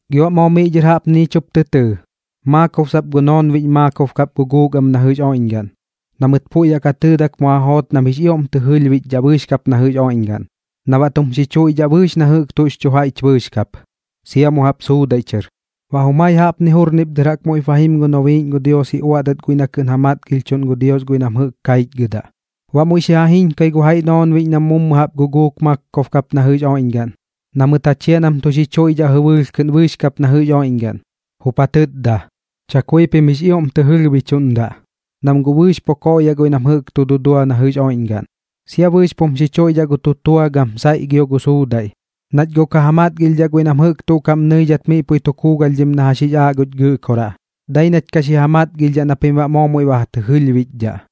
Gio baꞌ moo miꞌ dhɨr jaꞌpni ñich jup tɨ tɨɨ, maakob sap gu noonbiꞌñ gu Dios maakob kap guguuk am na jɨꞌx oiꞌñgaꞌn, na mɨt puiꞌ jaꞌk ja tɨɨdak mu ja joot nam jix ioꞌm tɨ jɨlhbichdhaꞌ bɨɨx kap na jɨꞌx oiꞌñgaꞌn na baꞌ tum xichuiꞌdhaꞌ bɨɨx na jɨꞌk tuꞌx chu jaiꞌch bɨɨx kap, sia mu jaꞌp suudaiꞌ chɨr. Baꞌ jumai jaꞌpni jurnip dɨr jaꞌk muiꞌp ba jim gu nobiiꞌñ gu Dios ji uaꞌdat guiꞌ na kɨꞌn ja matgilhchuꞌn gu Dios guiꞌ nam jɨꞌk kaichgɨdaꞌ. Baꞌ muiꞌ xi ja jiñkai gu jaiꞌ noonbiꞌñ nam mu jaꞌp guguuk maakob kap na jɨꞌx oiꞌñgaꞌn, na mɨt ja chia nam tu xichuiꞌdhaꞌ jɨbɨɨlh kɨꞌn bɨɨx kap na jɨꞌx oiꞌñgaꞌn, jup ja tɨtda: ―Chakui pim jix ioꞌm tɨ jɨlhbichuꞌndaꞌ, nam guꞌ bɨɨx pu koꞌyaꞌ guiꞌ nam jɨꞌk tu dudua na jɨꞌx oiꞌñgaꞌn, sia bɨɨx pum xichuiꞌdhaꞌ gu tutua gam saiꞌ gio gu suudaiꞌ, nach guꞌ ka ja matgilhdhaꞌ guiꞌ nam jɨꞌk tuꞌ kaꞌm nɨidhat miꞌ puiꞌ tu kuugalhdhim na jax jix aaꞌ guch Gɨꞌkoraꞌ. Dai nach ka xi ja matgilhdhaꞌ na pim baꞌ moo muiꞌ ba tɨ jɨlhbichdhaꞌ.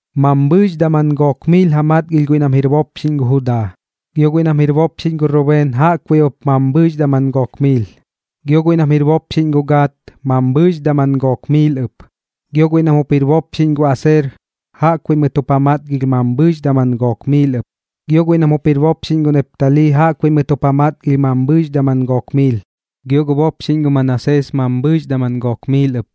Mambhɨɨx daman gook miil ja matgilh guiꞌ nam jir bopxiꞌñ gu Judaa, gio guiꞌ nam jir bopxiꞌñ gu Rubeen jaꞌkbuiꞌ ɨp mambhɨɨx daman gook miil, gio guiꞌ nam jir bopxiꞌñ gu Gaad mambhɨɨx daman gook miil ɨp, gio baꞌ guiꞌ nam jup jir bopxiꞌñ gu Aseer jaꞌkbuiꞌ mɨt jup ja matgilh mambhɨɨx daman gook miil, gio baꞌ guiꞌ nam jir bopxiꞌñ gu Neptalii jaꞌkbuiꞌ mɨt jup ja matgilh mambhɨɨx daman gook miil, gio gu bopxiꞌñ gu Manasees mambhɨɨx daman gook miil ɨp,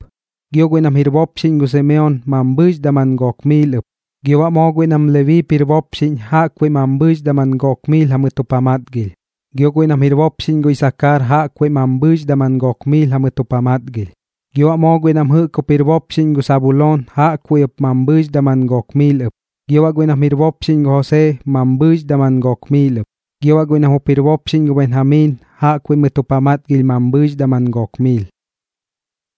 gio guiꞌ nam jir bopxiꞌñ gu Simeon mambhɨɨx daman gook miil ɨp, gio baꞌ moo guiꞌ nam Lebiip jir bopxiꞌñ jaꞌkbuiꞌ mambhɨɨx daman gook miil jamɨt jup ja matgilh, gio guiꞌ nam jir bopxiꞌñ gu Isakaar jaꞌkbuiꞌ mambhɨɨx daman gook miil jamɨt jup ja matgilh, gio baꞌ moo guiꞌ nam jɨꞌk jir bopxiꞌñ gu Sabuloon jaꞌkbuiꞌ ɨp mambhɨɨx daman gook miil ɨp, gio baꞌ guiꞌ nam jir bopxiꞌñ gu Josee mambhɨɨx daman gook miil ɨp, gio baꞌ guiꞌ nam jup jir bopxiꞌñ gu Benjamiin jaꞌkbuiꞌ mɨt jup ja matgilh mambhɨɨx daman gook miil.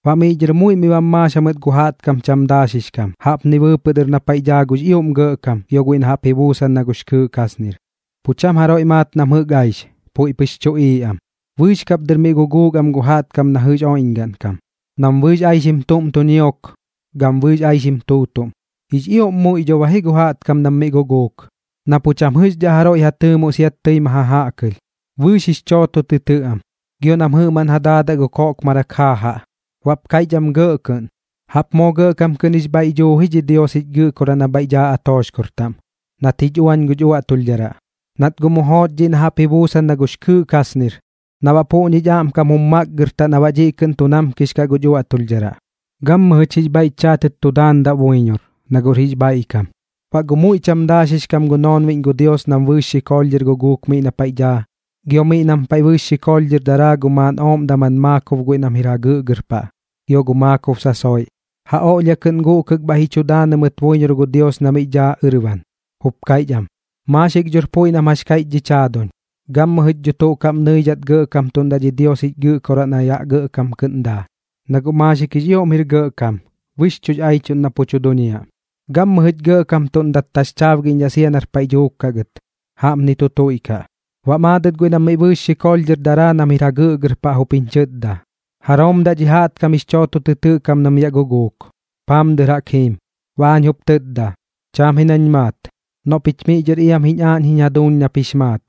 Baꞌ miꞌ dhɨr muiꞌ miꞌ bam maax jamɨt gu jaꞌtkam cham daaxix kam, jaꞌpni bɨɨpɨꞌ dɨr na paiꞌ daa gux ioꞌm Gɇꞌkam gio guiꞌ na jaꞌp ji buusan na gux kɨɨꞌ kasnir, pu cham jaroiꞌ maat nam jɨꞌk aix, puiꞌ pɨx tuꞌiiꞌ am. Bɨɨx kap dɨr miꞌ guguuk am gu jaꞌtkam na jɨꞌx oiꞌñgaꞌn kam, nam bɨɨx aixim tuꞌm tu ñiok gam bɨɨx aixim tuutuꞌm. Jix ioꞌm muiꞌ dho baꞌ ji gu jaꞌtkam nam mi guguuk, nam pu cham jɨꞌxdhaꞌ jaroiꞌ ja tɨɨmoꞌ siat tɨi ma ja jaꞌkɨlh. Bɨɨx jix chooto tɨ tɨꞌ am, gio nam jɨꞌmaꞌn ja daadaꞌ gu koꞌkmarak jaajaꞌ. Baꞌp kaiꞌch am gɇꞌ kɨꞌn: ¡Jaꞌp moo gɇꞌkam kɨꞌn jix bhaiꞌ duu ji dhi Dios jich Gɨꞌkoraꞌ na bhaiꞌ dhaa atooxkor taꞌm nat jich uañ guch uaꞌtulhdharaꞌ, nat guꞌ mu joot dhiꞌ na jaꞌp ji buusan na gux kɨɨꞌ kasnir na baꞌ puꞌñich aꞌmkam jum makgɨrtaꞌ na baꞌ kɨꞌn tu namkix kaꞌ guch uaꞌtulhdharaꞌ! Gammɨjɨch jix bhaiꞌch chaatɨt tu daandaꞌ buiñor, na guꞌr jix bhaiꞌkam. Baꞌ gu muiꞌ cham daaxix kam gu noonbiꞌñ gu Dios nam bɨɨx xikoolh dhɨr guguuk miꞌ na paiꞌ daa, gio miꞌ nam paiꞌ bɨɨx xikoolh dhɨr daraa gu maaꞌn ooꞌm daman maakob guiꞌ nam jir jagɨꞌgɨr paꞌ, gio gu maakob sasoiꞌ, ja oꞌlhia kɨꞌn guꞌkɨk bhaiꞌ ji chu daanɨ mɨt buiñor gu Dios na miꞌ daa ɨrban. Jup kaiꞌch am: Maaxik dhor puiꞌ nam jax kaiꞌch dhich jaaduñ, gammɨjɨch dho tuꞌ kaꞌm nɨidhat gɇꞌkamtuꞌndaꞌ dhi Dios jich Gɨꞌkoraꞌ na yaꞌ gɇꞌkam kɨꞌn daa, na guꞌ maaxik jix ioꞌm jir Gɇꞌkam, bɨxchuꞌx aichuꞌn na pu tu duñiaꞌ. Gammɨjɨch gɇꞌkamtuꞌndat taxchaabgiꞌñdhaꞌ sia nar paiꞌ dhuuk kaꞌ gɨt. Jaꞌpni tu tuiꞌkaꞌ. Baꞌ maadɨt guiꞌ nam miꞌ bɨɨx xikoolh dhɨr daraa nam jir jagɨꞌgɨr paꞌ jup jiñ chɨtda: ―¿Jaroom daꞌ dhi jaꞌtkam jix chooto tɨ tɨꞌ kam nam yaꞌ guguuk? ¿Paam dɨr jaꞌk jiim? Baꞌ aañ jup tɨtda: ―Cham ji nañ maat. Noꞌ pich miꞌ dhɨr iam jiñ aaꞌñ jiñ jaduuñ nap jix maat.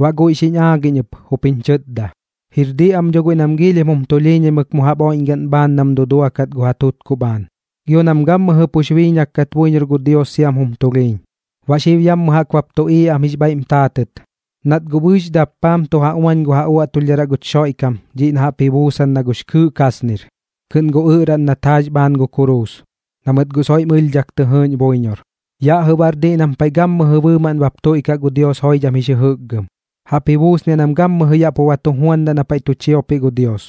Baꞌ guiꞌ xiñ aagiꞌñ ɨp, jup jiñ chɨtda: ―Jir diꞌ am dho guiꞌ nam giilhim jum tulhiiñaimɨk mu jaꞌp oiꞌñgaꞌn bhaan nam duduakat gu ja tutkuꞌ bhaan, gio nam gammɨjɨ pux biiñak kat buiñor gu Dios siam jum tulhiiñ. Baꞌ xib yammɨ jaꞌk bap tuꞌiiꞌ am jix bhaiꞌm taatɨt, nat guꞌ bɨɨx dappaam tu ja uañ gu ja uaꞌtulhdharaꞌ guch Xoiꞌkam, dhiꞌ na jaꞌp ji buusan na gux kɨɨꞌ kasnir, kɨꞌn gu ɨꞌraꞌn nat jaax bhaan gu kuruus, na mɨt guꞌ soiꞌm ɨlhdhak tɨ jɨɨꞌñ buiñor. Yaꞌ jɨꞌ bar diꞌ nam paiꞌ gammɨjɨ bɨɨmaꞌn bap tuiꞌkaꞌ gu Dios joidham jix jɨjɨkgɨm, jaꞌp ji buusniaꞌ nam gammɨjɨ yaꞌ pu ba tu juandaꞌ na paiꞌ tu chiopiꞌ gu Dios.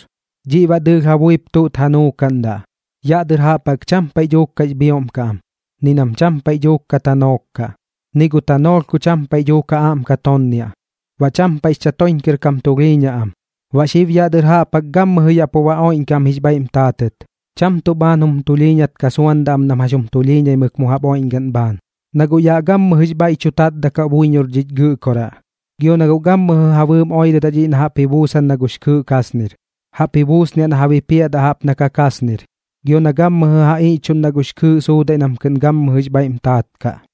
Dhiꞌ baꞌ dɨɨlh ja buip tuꞌt ja nuukaꞌndaꞌ. Yaꞌ dɨr jaꞌp jaꞌk cham paiꞌ dhuuk kax bhioꞌn kaꞌ am, ni nam cham paiꞌ dhuuk ka tanook kaꞌ, ni gu tanoolh ku cham paiꞌ dhuuk ja aꞌm ka tonniaꞌ, baꞌ cham paiꞌx chatoiñ kɨr kam tulhiiñaꞌ am. Baꞌ xib yaꞌ dɨr jaꞌp jaꞌk gammɨjɨ yaꞌ pu ba oiꞌñkaꞌ am jix bhaiꞌm taatɨt, cham tuꞌ bhaan jum tulhiiñat ka suandaꞌ am nam jax jum tulhiiñaimɨk mu jaꞌp oiꞌñgaꞌn bhaan, na guꞌ yaꞌ gammɨjɨx bhaiꞌ tu tatdaꞌ buiñor dhich Gɨꞌkoraꞌ, gio na guꞌ gammɨjɨ ja bɨɨm oirɨdaꞌ dhiꞌ na jaꞌp ji buusan na gux kɨɨꞌ kasnir, jaꞌp ji buusniaꞌ na ja bipiaꞌdaꞌ jaꞌp na kakasnir, gio na gammɨjɨ ja iꞌchuꞌndaꞌ gux kɨɨꞌ suudaiꞌ nam kɨꞌn gammɨjɨx bhaiꞌm taat kaꞌ.